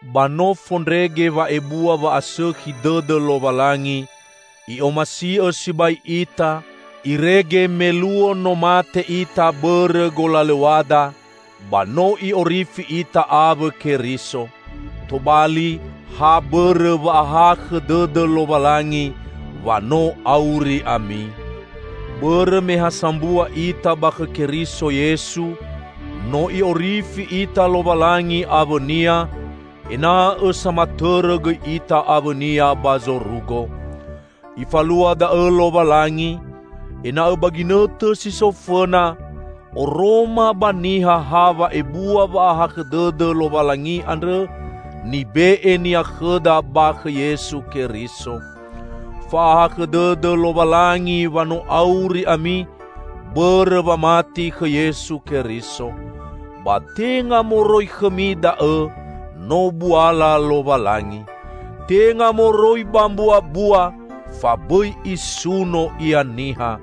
Ba no fondrege wa'ebua wa'asõkhi dõdõ Lowalangi! I'omasi'õ sibai ita, irege me luo no mate ita bõrõ golalõw̃ada, ba no I'orifi ita awõ Keriso. Tobali, ha bõrõ wa'ahakhõ dõdõ Lowalangi, wa no auri ami. Bõrõ me ha sambua ita ba khõ Keriso Yesu, no I'orifi ita Lowalangi awõ-Nia, ena'õ samatõrõ gõi ita awõ-Nia ba zorugo. Ifalua da'õ Lowalangi, ena'õ ba ginõtõ si so fõna, oroma ba niha ha wa'ebua wa'ahakhõ dõdõ Lowalangi andrõ nibe'e-Nia khõda ba khõ Yesu Keriso. Fa'ahakhõ dõdõ Lowalangi, wa no auri ami, bõrõ wamati khõ Yesu Keriso. Ba tenga moroi khõmi da'õ, no buala Lowalangi. Tenga moroi ba mbuabua fa bõi isuno ia niha.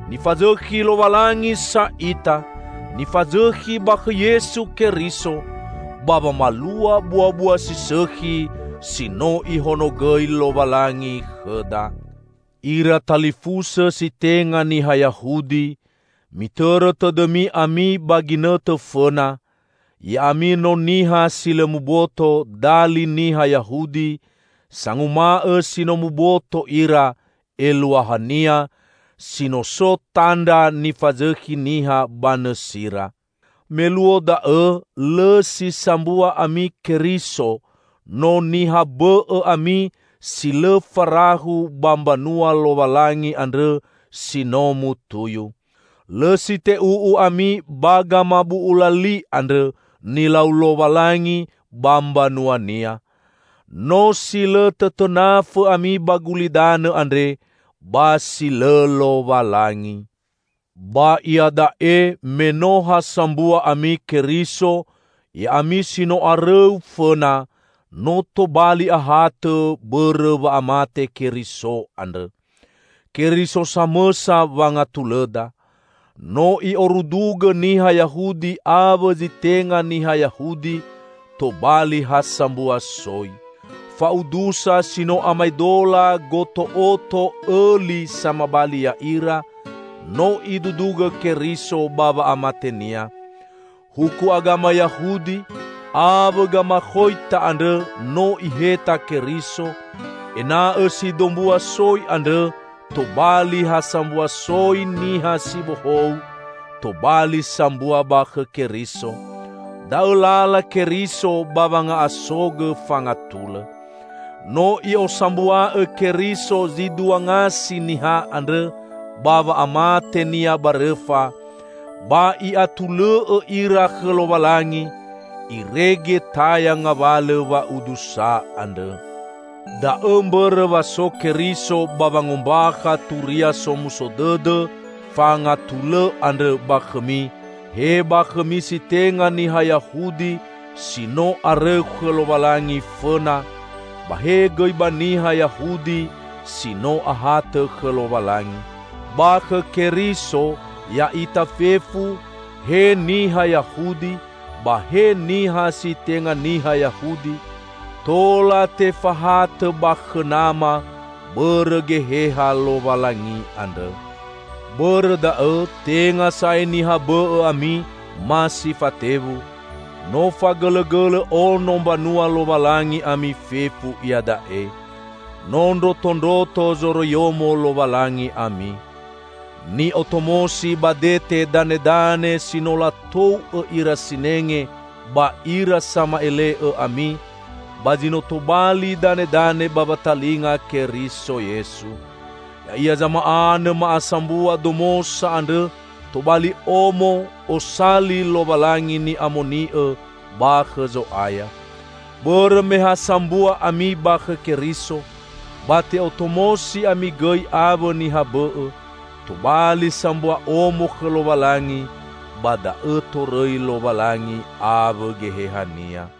Nifazõkhi Lowalangi sa ita, nifazõkhi ba khõ Yesu Keriso, ba wamalua buabua si sõkhi si no Ihonogõi Lowalangi khõda. Ira talifusõ si tenga niha Yahudi! Mitõrõ tõdõmi ami ba ginõtõ fõna: Ya'ami no "niha si lõ muboto", dali niha Yahudi, sanguma'õ si no muboto ira (eluahania, si no so tandra nifazõkhi niha ba nõsira). Me luo da'õ lõ si sambua ami Keriso, no niha bõ'õ ami si lõ farahu ba mbanua Lowalangi andrõ si no mutuyu. Lõ si te'u'u ami ba gamabu'ula li andrõ, nilau Lowalangi ba mbanua-Nia. No si lõ tõtõnafõ ami ba gulidanõ andre ba si lõ Lowalangi. Ba iada'e, me no ha sambua ami Keriso, ya'ami si no arõu fõna, no tobali ahatõ bõrõ wa'amate Keriso andrõ. Keriso samõsa wangatulõda. No I'orudugõ niha Yahudi awõ zi tenga niha Yahudi tobali ha sambua soi. Fa'udusa si no amaedola goto'oto õli samabali ya'ira, no Idudugõ Keriso ba wa'amate-Nia. Huku agama Yahudi awõ gamakhoita andrõ no Iheta Keriso, ena'õ si dombua soi andrõ tobali ha sambua soi niha si bohou, tobali sambua ba khõ Keriso. Da'õ lala Keriso ba wanga'asogõ fangatulõ. No i'osambua'õ Keriso zi dua ngasi niha andrõ ba wa'amate-Nia ba rõfa, ba I'atulõ'õ ira khõ Lowalangi, irege taya ngawalõ wa'udusa andrõ. Da'õ mbõrõ wa so Keriso ba wangombakha Turia Somuso Dõdõ fangatulõ andrõ ba khõmi, he ba khõmi si tenga niha Yahudi si no arõu khõ Lowalangi fõna, ba he gõi ba niha Yahudi si no ahatõ khõ Lowalangi. Ba khõ Keriso, ya'ita fefu -- he niha Yahudi ba he niha si tenga niha Yahudi -- tola tefahatõ ba khõ Nama bõrõ Geheha Lowalangi andrõ. Bõrõ da'õ, tenga sa'ae niha bõ'õ ami, ma si fatewu. No fagõlõgõlõ ono Mbanua Lowalangi ami fefu iada'e. No ndrotondroto zoroiyomo Lowalangi ami. Ni'otomosi ba dete danedane si no latou'õ ira sinenge ba ira sama'ele'õ ami, ba zi no tobali danedane ba watalinga Keriso Yesu. Ya'ia zama'anõ ma'asambua domosa andrõ tobali omo (osali) Lowalangi ni'amoni'õ ba khõ Zo'aya. Bõrõ me ha sambua ami ba khõ Keriso, ba te'otomosi ami gõi awõ niha bõ'õ, tobali sambua omo khõ Lowalangi, ba da'õ torõi Lowalangi awõ Geheha-Nia.